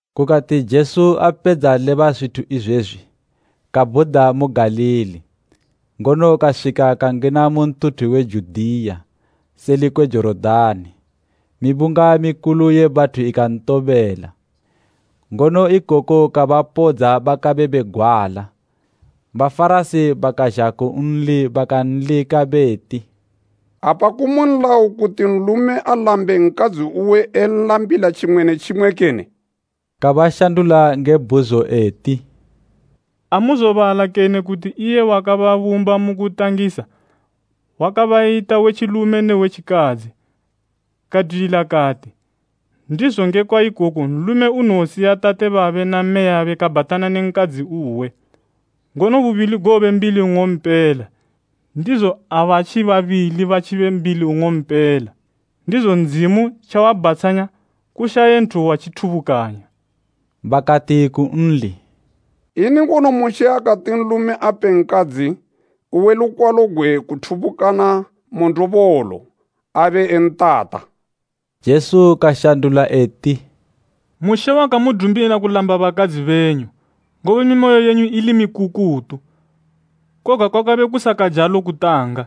Kukati Jesu apedza leba zwithu izwezwi, kabhuda mu Galili, ngono kaswika kangina mu ntuthu we Judiya seli kwe Jorodani. Mibunga mikulu ye bathu ikantobela, ngono ikoko kabapodza bakabe begwala. Bafarasi bakazha kunli bakanlika beti “Apa kumu nlayo kuti nlume alambe nkadzi uwe enlambila tjimwe ne tjimwe kene?” Kabashandula nge bhuzo eti, “Amuzobala kene kuti iye wakababumba mu kutangisa wakabayita we tjilume ne we tjikadzi, kadwilila kati, ‘Ndizo ngekwa ikoko nlume unowosiya tate babe na mmeyabe kabhatana ne nkadzi uwe, ngono bubili gowobe mbili nng'ompela?’ Ndizo abatji babili batjibe mbili nng'ompela. Ndizo Ndzimu tjawabhatshanya, kushaye nthu watjithubukanya.” Bakati kunli, “Ini ngono Mushe akati nlume ape nkadzi uwe lukwalo gwe kuthubukana mu ndobolo abentata?” Jesu kashandula eti, “Mushe wakamudumila kulamba bakadzi benyu, ngobe mimoyo yenyu ili mikukutu. Koga kwakabe kusakajalo kutanga.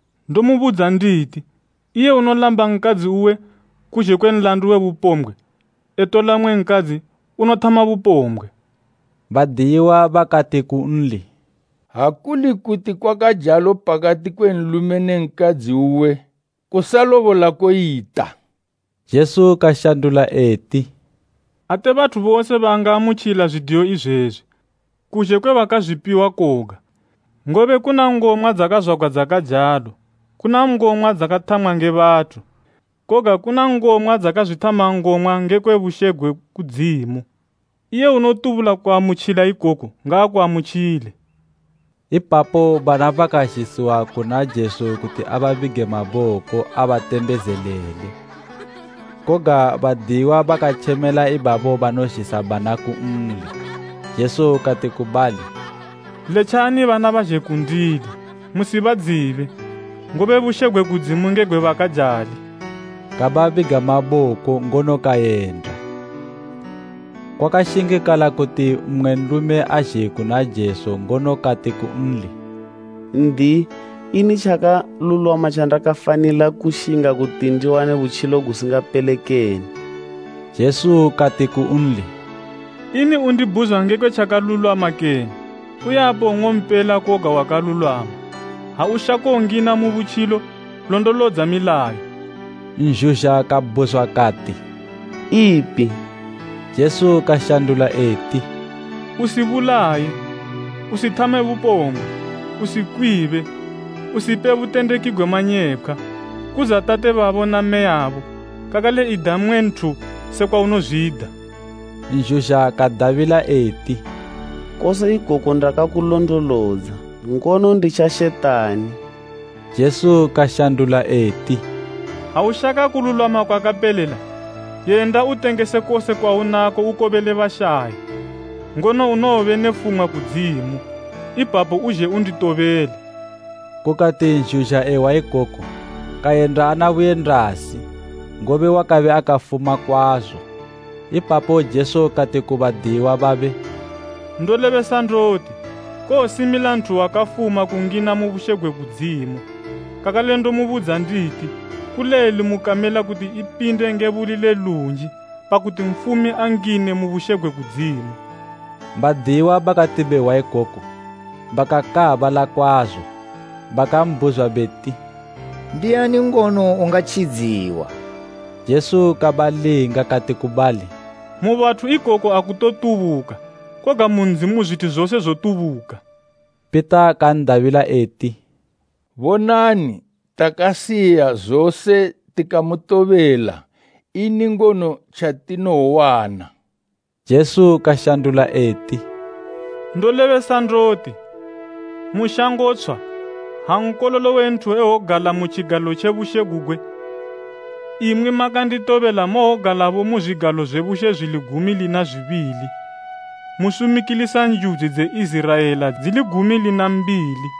Ndomubudza nditi, iye unolamba nkadzi uwe, kuzhe kwe nlandu we bupombgwe, etola mmwe nkadzi, unothama bupombgwe.” 10Badiyiwa bakati kunli, “Ha kuli kuti kwakajalo pakati kwe nlume ne nkadzi uwe, kusalobola koyita.” 11Jesu kashandula eti, “Ate bathu bose bangaamutjila zwidiyo izwezwi, kuzhe kwe bakazwipiwa koga. Ngobe kuna ngomwa dzakazwagwa dzakajalo, kuna ngomwa dzakathamwa nge bathu, koga kuna ngomwa dzakazwithama ngomwa ngekwe bushe gwe kudzimu. Iye unotubula kuamutjila ikoku ngaakuamutjile.” Ipapo bana bakazhisiwa kuna Jesu kuti ababige maboko abatembezelele. Koga badiyiwa bakatjemela ibabo banozhisa bana kunli. Jesu kati ku bali, “Letjani bana bazhe kundili, musibadzibe, ngobe bushe gwe kudzimu nge gwe bakajali.” Kababiga maboko ngono kayenda. Kwakashingikala kuti mmwe nlume azhe kuna Jesu ngono kati kunli, “N'diyi, ini tjakalulwama tjandakafanila kushinga kuti ndiwane butjilo gusingapele kene?” Jesu kati kunli, “Ini undibhuzwa ngekwe tjakalulwama kene? Uyapo nng'ompela koga wakalulwama. Ha ushako ngina mu butjilo, londolodza milayo.” Nzhuzha kabhuzwa kati, “Ipi?” Jesu kashandula eti, “Usibulaye, usithame bupombgwe, usikwibe, usipe butendeki gwe manyepkhwa, kudza tate babo na mmeyabo, kakale ida mmwe nthu sekwa unozwida.” Nzhuzha kadabila eti, “Kose ikoku ndakakulondolodza. Ngono nditjashetani?” Jesu kashandula eti, “Ha ushaka kululwama kwakapelela, yenda utengese kose kwaunako ukobele bashayi, ngono unowobe ne fumwa kudzimu. Ipapo uzhe unditobele.” Kukati nzhuzha ehwa ikoku kayenda ana buyendasi, ngobe wakabe akafuma kwazo. Ipapo Jesu kati ku badiyiwa babe, “Ndolebesa ndoti, kowosimila nthu wakafuma kungina mu bushe gwe kudzimu. Kakale ndomubudza nditi kulelu mu kamela kuti ipinde nge buli le lunji, pakuti nfumi angine mu bushe gwe Ndzimu.” Badiyiwa bakati behwa ikoku bakakaabala kwazo bakambhuzwa beti, “Ndiani ngono ungatjidziwa?” Jesu kabalinga kati ku bali, “Mu bathu ikoku akutotubuka koga mu Ndzimu zwithu zose zotubuka.” Pita kan'dabila eti, “Bonani, takasiya zose tikamutobela. Ini ngono tjatinowowana?” Jesu kashandula eti, “Ndolebesa ndoti, mu shango tshwa, ha Nkololo we Nthu ewogala mu tjigalo tje bushe gugwe, imwi makanditobela mowogalabo mu zwigalo zwe bushe zwili gumi lina zwibili, musumikilisa njudzi dze Iziraela dzili gumi lina mbili.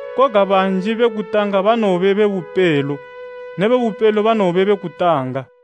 Koga banji be kutanga banowobe be bupelo ne be bupelo banowobe be kutanga.